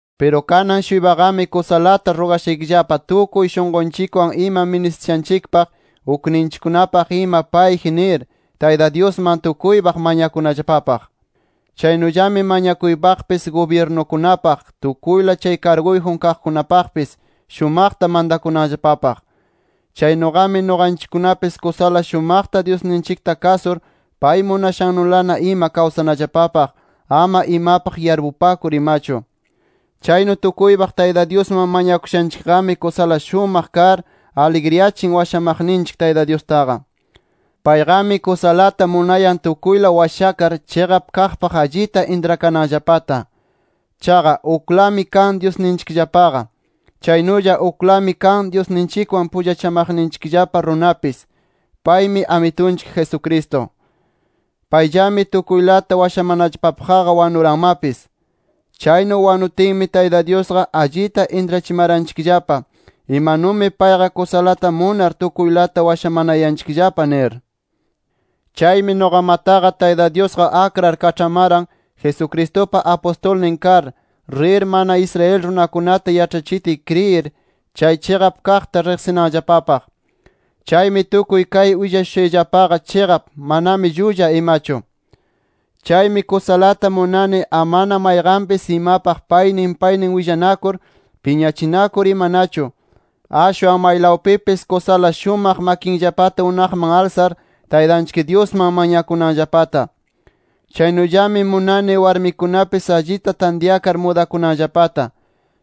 Piru kanan-shuypaqami kusalata rugashaykillapa tukuy shunqunchikwan ima ministishanchikpaq, ukninchikkunapaq ima payji nir Tayta Dyusman tukuypaq mañakunallapapaq. Chaynullami mañakuypaqpis gubyirnukunapaq, tukuyla chay karguyjun kaqkunapaqpis, shumaqta mantakunanllapapaq. Chaynuqami nuqanchikkunapis kusala shumaqta Dyusninchikta kasur pay munashannulana ima kawsanallapapaq, ama imapaq yarpupakur imachu. Chaynu tukuypaq Tayta Dyusman mañakushanchikqami kusala shumaq kar, aligriyachin washamaqninchik Tayta Dyustaqa. Payqami kusalata munayan tukuyla washakar, chiqap kaqpaq allita intrakananllapata. Chaqa, uklami kan Dyusninchikllapaqa. Chaynulla uklami kan Dyusninchikwan pullachamaqninchikllapa runapis. Paymi Amitunchik Jesucristo. Payllami tukuylata washamanallapapaqqa wanuranmapis. Chaynu wanutinmi Tayta Dyusqa allita intrachimaranchikllapa imanumi payqa kusalata munar tukuylata washamanayanchikllapa nir. Chaymi nuqamataqa Tayta Dyusqa akrar kaĉhamaran Jesucristupa apustulnin kar, rir mana Israel runakunata yaĉhachitiy kriyir chay chiqap kaqta riqsinanllapapaq. Chaymi tukuy kay willashushayllapaqa chiqap, manami llulla imachu. Chaymi kusalata munani amana mayqanpis imapaq paynin paynin willanakur, piñachinakur imanachu, ashwan maylawpipis kusala shumaq makinllapata unaqman alsar, Taytanchik Dyusman mañakunanllapata. Chaynullami munani warmikunapis allita tantyakar mudakunanllapata.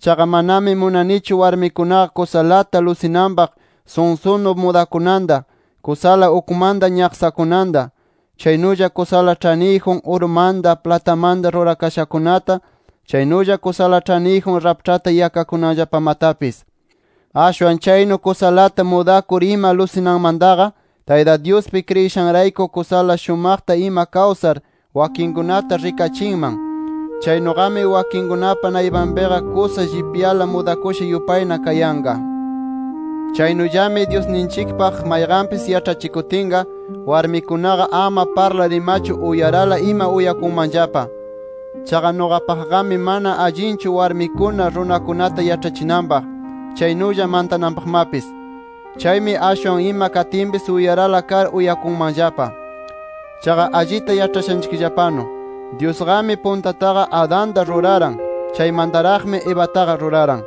Chaqa manami munanichu warmikunaqa kusalata lusinanpaq sunsunu mudakunanta, kusala ukmanta ñaqsakunanta, chaynulla kusala ĉhaniyjun urumanta, platamanta rurakashakunata, chaynulla kusala ĉhaniyjun raĉhpata yakakunanllapamatapis. Ashwan chaynu kusalata mudakur ima lusinanmantaqa, Tayta Dyuspi kriyishanrayku kusala shumaqta ima kawsar wakinkunata rikachinman. Chaynuqami wakinkunapa naypanpiqa kusa llipyala mudakusha yupayna kayanqa. Chaynullami Dyusninchikpaq mayqanpis yaĉhachikutinqa, warmikunaqa ama parlar imachu, uyarala ima uyakunmanllapa. Chaqa nuqapaqqami mana allinchu warmikuna runakunata yaĉhachinanpaq, chaynulla mantananpaqmapis. Chaymi ashwan ima katinpis uyarala kar uyakunmanllapa. Chaqa allita yaĉhashanchikllapanu Dyusqami puntataqa Adanta ruraran. Chaymantaraqmi Evataqa ruraran.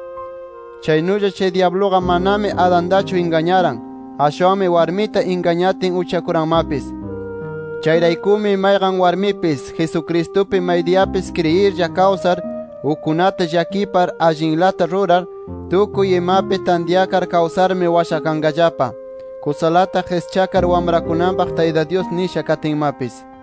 Chaynulla chay dyabluqa manami Adantachu ingañaran. Ashwanmi warmita ingañatin, uchakuranmapis. Chayraykumi mayqan warmipis, Jesucristupi maydiyapis kriyirlla kawsar, ukkunata llakipar, allinlata rurar, tukuy imapi tantyakar kawsarmi washakanqallapa, kusalata qischakar wamrakunanpaq Tayta Dyus nisha katinmapis.